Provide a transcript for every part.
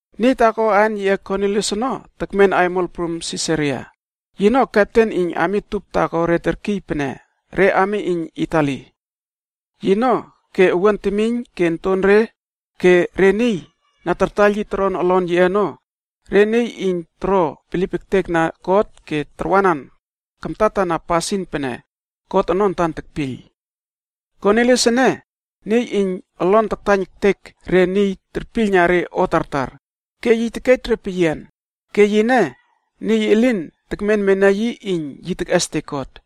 Niy taako aan yiꞌe Kornilius ono tekmen aimol prum Sisaria, ke yino kepten iyn ami tup taako re terkiy pene “Re Ami Iyn Itali.” Yino ke owuan temiyn ke ontonre ke re niy na tartaiyl yi toron olon yiꞌe ono, re niy iyn toro bilip ektek na God ke tarwanan kamtatana re pasin pene God ono antan tekpiyl. Kornilius ene, niy iyn olon taktaiyn ektek re niy terpiylna re o tartar ke yi tekej re peyian, ke yine niy elin tekmenmena yi iyn tekꞌestek God.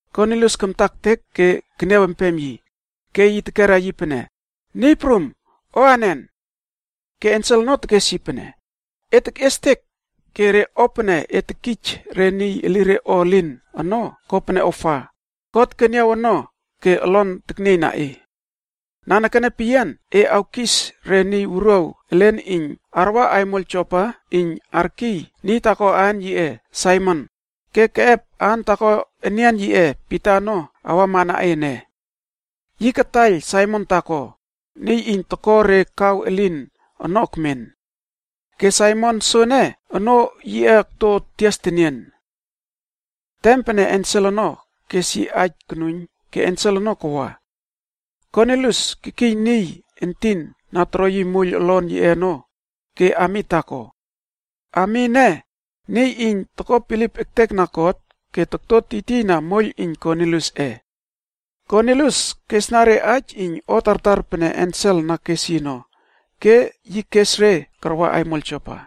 Kornilius kamta ektek ke keniaw empem yi, ke yi tekera yi pene, “Niy prum, o anen?” Ke ensel ono tekes yi pene, “E tekꞌiestek, ke re o pene e tekij re niy elire o elin ono kopene ofa, God keniaw ono ke olon teknieiyna e. Nanekene peyian e awkis re niy wuruaw elen iyn arwa aimol Jopa iyn arkiy niy taako aan yiꞌe Saimon ke keꞌep aan taako enian yiꞌe Pita ono awamana e ene. Yi kataiyl Saimon taako, niy iyn toko re kaw elin ono ekmen. Ke Saimon soene, onoo yiꞌe okto tias tenien.” Tem pene ensel ono kes yi aij konuiyn ke ensel ono kawa. Kornilius kekiy niy entin na toro moiyl olon yiꞌe ono ke ami taako. Ami ene, niy iyn toko bilip ektekna God ke tokto tiytiyna moiyl iyn Korniliusꞌe. Kornilius kesna re aij iyn o tartar pene ensel na kes yi ono, ke yi kes re karwa aimol Jopa.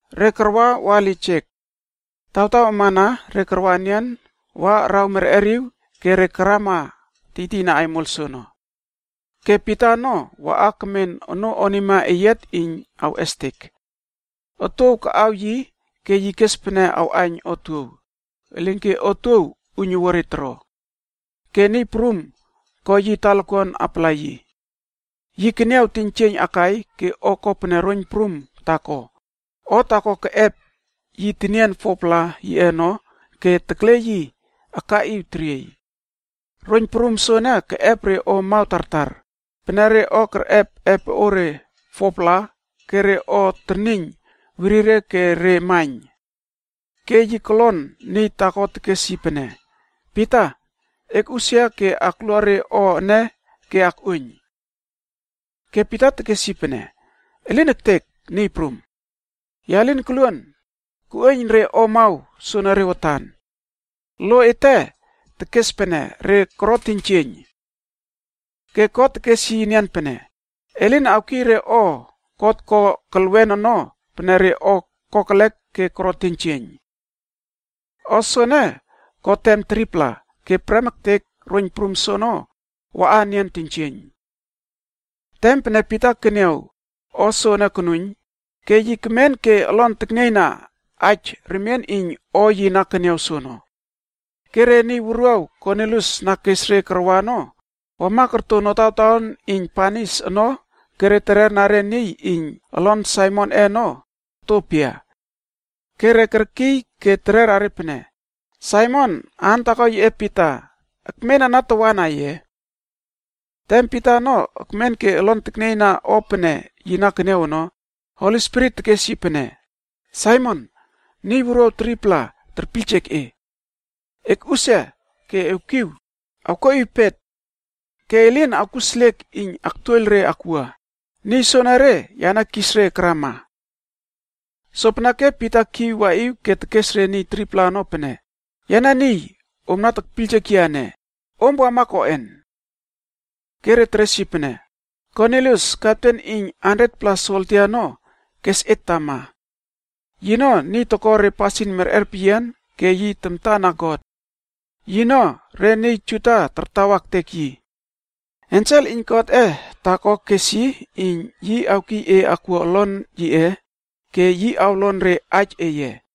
Re karwa wa lijek. Tawtaw amana re karwa enian wa, araw merꞌeriw re karama tiytiyna aimol soono. Ke Pita ono waꞌa kemen onoo onima iyn yi awꞌestek. Otuow kaꞌaw yi ke yi kes pene awꞌaiyn otuow, elinke otuow uiynuwua re toro. Ke Niy Prum ko yi talakuan apala yi. Yi keniaw teiynjieiyn akai ke o kopene roiyn prum taako, o taako keꞌep yi tenien 4-pla yiꞌe ono ke tekle yi akaꞌiw teriey. Roiyn prum soene keꞌep re o amaw tartar, pene re o kerꞌep epoꞌore 4-pla ke re o terniyn werire ke re maiyn. Ke yi kolon niy taako tekes yi pene, “Pita! Ekꞌusia ke aklua re o ene ke ekꞌuoiyn.” Ke Pita tekes pene, “Elin ektek, Niy Prum. Ya lin koluon koꞌuoiyn re o amaw soenere watan. Lo ete tekes pene re koro teiynjieiyn.” Ke God tekes yi enian pene, “E lin awkiy re o God ko kelwen ono pene re o kokelek ke koro teiynjieiyn.” O soene ko tem 3-pla, ke prem ektek roiyn prum soono waꞌa enian teiynjieiyn. Tem pene Pita keniaw o soene konuiyn, ke yi kemen ke olon teknieiyna aij remien iyn o yi na keniaw soono. Ke re niy wuruaw Kornilius na kes re karwa ono, wama korto notawtaon iyn banis ono ke tererna re niy iyn olon Saimonꞌe ono okto pia. Ke re kerkiy ke terera pene, “Saimon aan taako yiꞌe Pita ekmen ana tawana ye?” Tem Pita ono ekmen ke olon teknieiyna o pene yi na keniaw ono, Holi Spirit tekes yi pene, “Saimon! Niy wuruaw 3-pla terpiyljek e. Ekꞌusia ke ewkiw awkuaꞌiw pet. E lin awkuseliek iyn aktuoiyl re akwua, niy soenere yane kis re karama.” Sopeneke Pita kiw waꞌiw ke tekes re niy 3-pla ono pene, “Yane niy om na tekpiyljek yia ene. Om wama koꞌen?” Ke re teres yi pene, “Kornilius, kepten iyn 100-pla soldia ono kes et tama. Yino niy iyn tamtana God ke toko re pasin merꞌer peyian. Yino niy re Juda tartawa ektek yi. Ensel holi taako iyn Godꞌe kes yi iyn awkiy e akwua olon yiꞌe ke yi awlon re aij eye.”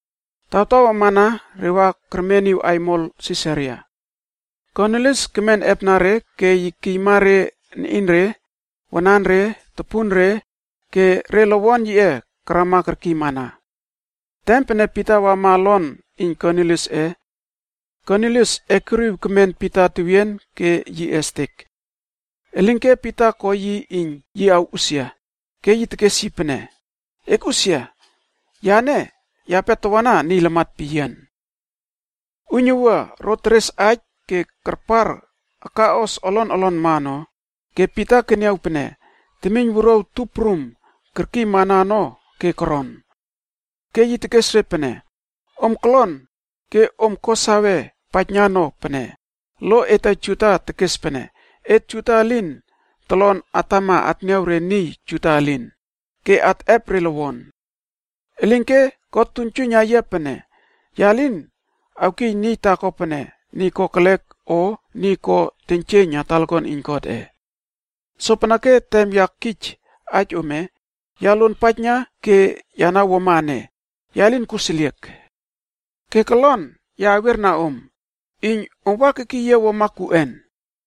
Tawtaw amana re wa kermeniw aimol Sisaria. Kornilius kemen epna re ke yi kekiyma re niꞌinre, wananre, topunre ke re lowon yiꞌe karama kerkiymana. Tem pene Pita wama olon iyn Korniliusꞌe, Kornilius ekuriw kemen Pita tewien ke yi estek. Elinke Pita ko yi iyn yi awꞌusia, ke yi tekes yi pene, “Ekꞌusia! Yane, yape tawana niy lamat peyian.” Uiynuwua ro teres aij ke karpar akaꞌos olon olonma ono, ke Pita keniaw pene temiyn wuruaw tup prum kerkiymana ono ke koron. Ke yi tekes re pene, “Om kolon ke om ko sawe paijna no pene lo ete Juda tekes pene et Juda elin tolon atwa atniaw re niy Juda elin, ke atꞌep re lowon. Elinke God tuiynjuiyna yia pene ya lin awkiy niy taako pene niy kokelek o niy ko teiynjieiyna talakuan iyn Godꞌe. Sopeneke tem ya kij aij ome, ya luonpaijna ke ya na wuama ene, ya lin kuseliek. Ke kolon ya awiera om, iyn om wa kekiy yia koꞌen?”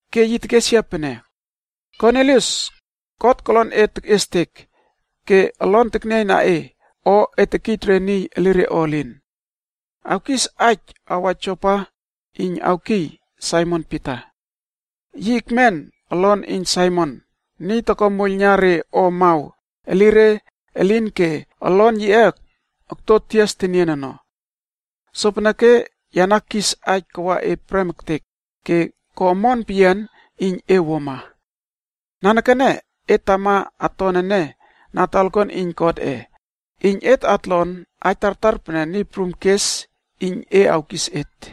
ke yi tekes yia pene, ‘Kornilius, God kolon e tekꞌiestek ke olon teknieiyna o e tekij re niy elire o elin. Awkis aij awa Jopa iyn awkiy Saimon Pita. Yi ekmen olon iyn Saimon, niy toko moiyl na re o amaw elire elin ke olon yiꞌe akto tias tenien ono.’ Sopeneke ya na kis aij kawa e prem ektek, ke ko omon peyian iyn e wuama. Nanekene et tama aton ene na talakuan iyn Godꞌe, iyn et atlon aij tartar pene Niy Prum kes iyn e awkis et.”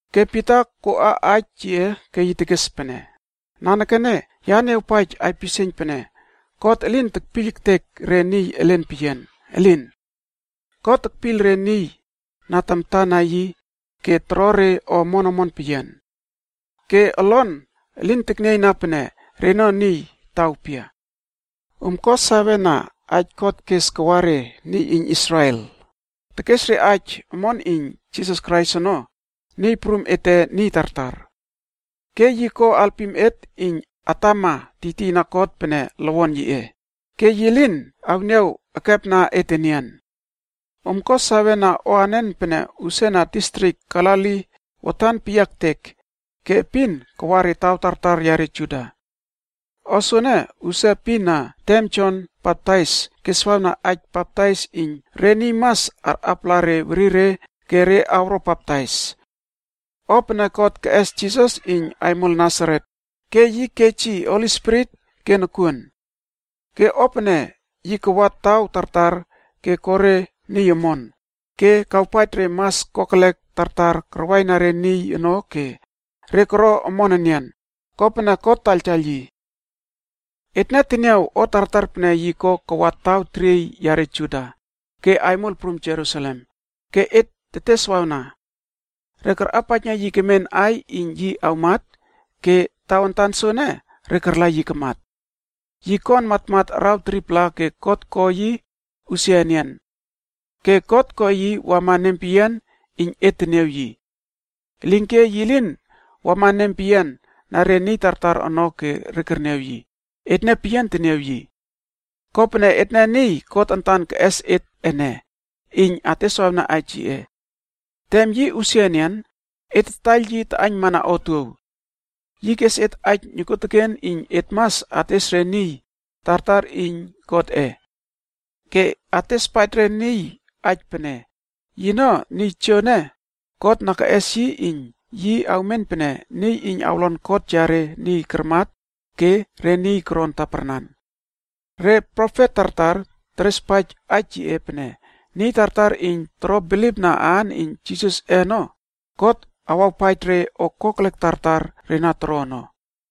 Ke Pita koꞌa aij yiꞌe ke tekes pene, “Nanekene ya niawpaij aipisieiyn pene God elin tekpiyl ektek re niy elen peyian, elin! God tekpiyl re niy na tamta na yi ke toro re o omon omon peyian. Ke olon elin teknieiyna pene reno niy taw pia. Om ko sawe na aij God kes kawa re niy iyn Israel, tekes aij omon iyn Jisas Krais ono Niy Prum ete niy tartar. Ke yi ko alpim et iyn atama tiytiyna God pene lowon yiꞌe, ke yi lin awniaw ekepna et enian. Om ko sawe na o anen pene usia distrik Galili watan peyia ektek, ke epin kawa re taw tartar yare Juda. O soene usia epin na tem Jon Baptais keswawna aij baptais iyn re niy mas arꞌapala re werire ke re awro baptais. O pene God keꞌes Jisas iyn Aimol Nasaret, ke yi kej yi Holi Spirit ke nokuon. Ke o pene yi kawa taw tartar ko re niy omon, ke kawpaij re mas kokelek tartar karwaina re niy ono ke re koro omon enian, kopene God taktaiyltaiyl yi. “Etne teniaw o tartar pene yi ko kawa taw teriey yare Juda, ke aimol prum Jerusalem, ke et teteswawna. Re karꞌapaijna yi kemen aiy iyn yi awmat ke tawantan soene re karla yi kamat. Yi kon matmat araw 3-pla ke God ko yi usia enian. Ke God ko yi wama nempeyian iyn et teniaw yi. Elinke yi lin wama nempeyian na re niy tartar ono ke re kerniaw yi, etne peyian teniaw yi. Kopene etne niy God antan keꞌes et ene, iyn ateswawna aij yiꞌe. Tem yi usia enian, et tataiyl yi taꞌaiynmana otuow. Yi kes et aij nokuoteken iyn et mas ates re niy tartar aij iyn Godꞌe. Ke atespaij re niy aij pene, yino niy tojoene God na keꞌes yi iyn yi awmen pene niy iyn awlon kot yare niy karmat ke re niy koron taparnan. Re profet tartar terespaij aij yiꞌe pene niy tartar iyn toro bilipna aan iyn Jisasꞌe ono, God awawpaij re o kokelek tartar re na toro ono.”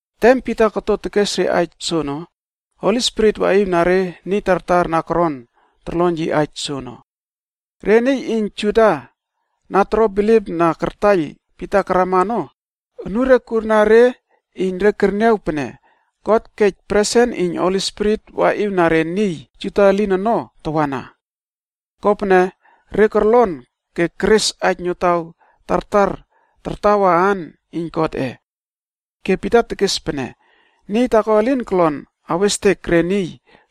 Tem Pita koto tekes re aij soono, Holi Spirit waꞌiw na re niy tartar na koron torlon yi aij soono. Re niy iyn Juda na toro bilipna kartaiyl Pita karama ono, anure kurna re iyn re kerniaw pene God kej presen iyn Holi Spirit waꞌiwna re niy Juda elin ono tawana. Kopene re korlon re keres aij notaw tartar tartawa aan iyn Godꞌe. Ke Pita tekes pene, “Niy taako elin kolon awestek re niy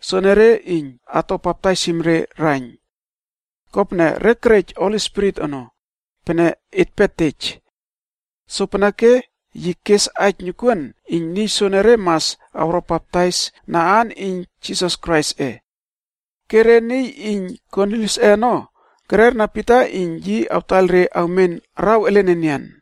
soenere iyn ato baptaisim re raiyn. Kopene re kerej Holi Spirit ono, pene etpe tej.” Sopeneke yi kes aij nokuon iyn niy soenere mas awro baptais na aan iyn Jisas Kraisꞌe. Ke re niy iyn Korniliusꞌe ono kererna Pita iyn yi awtaiyl re awmen araw elen enian.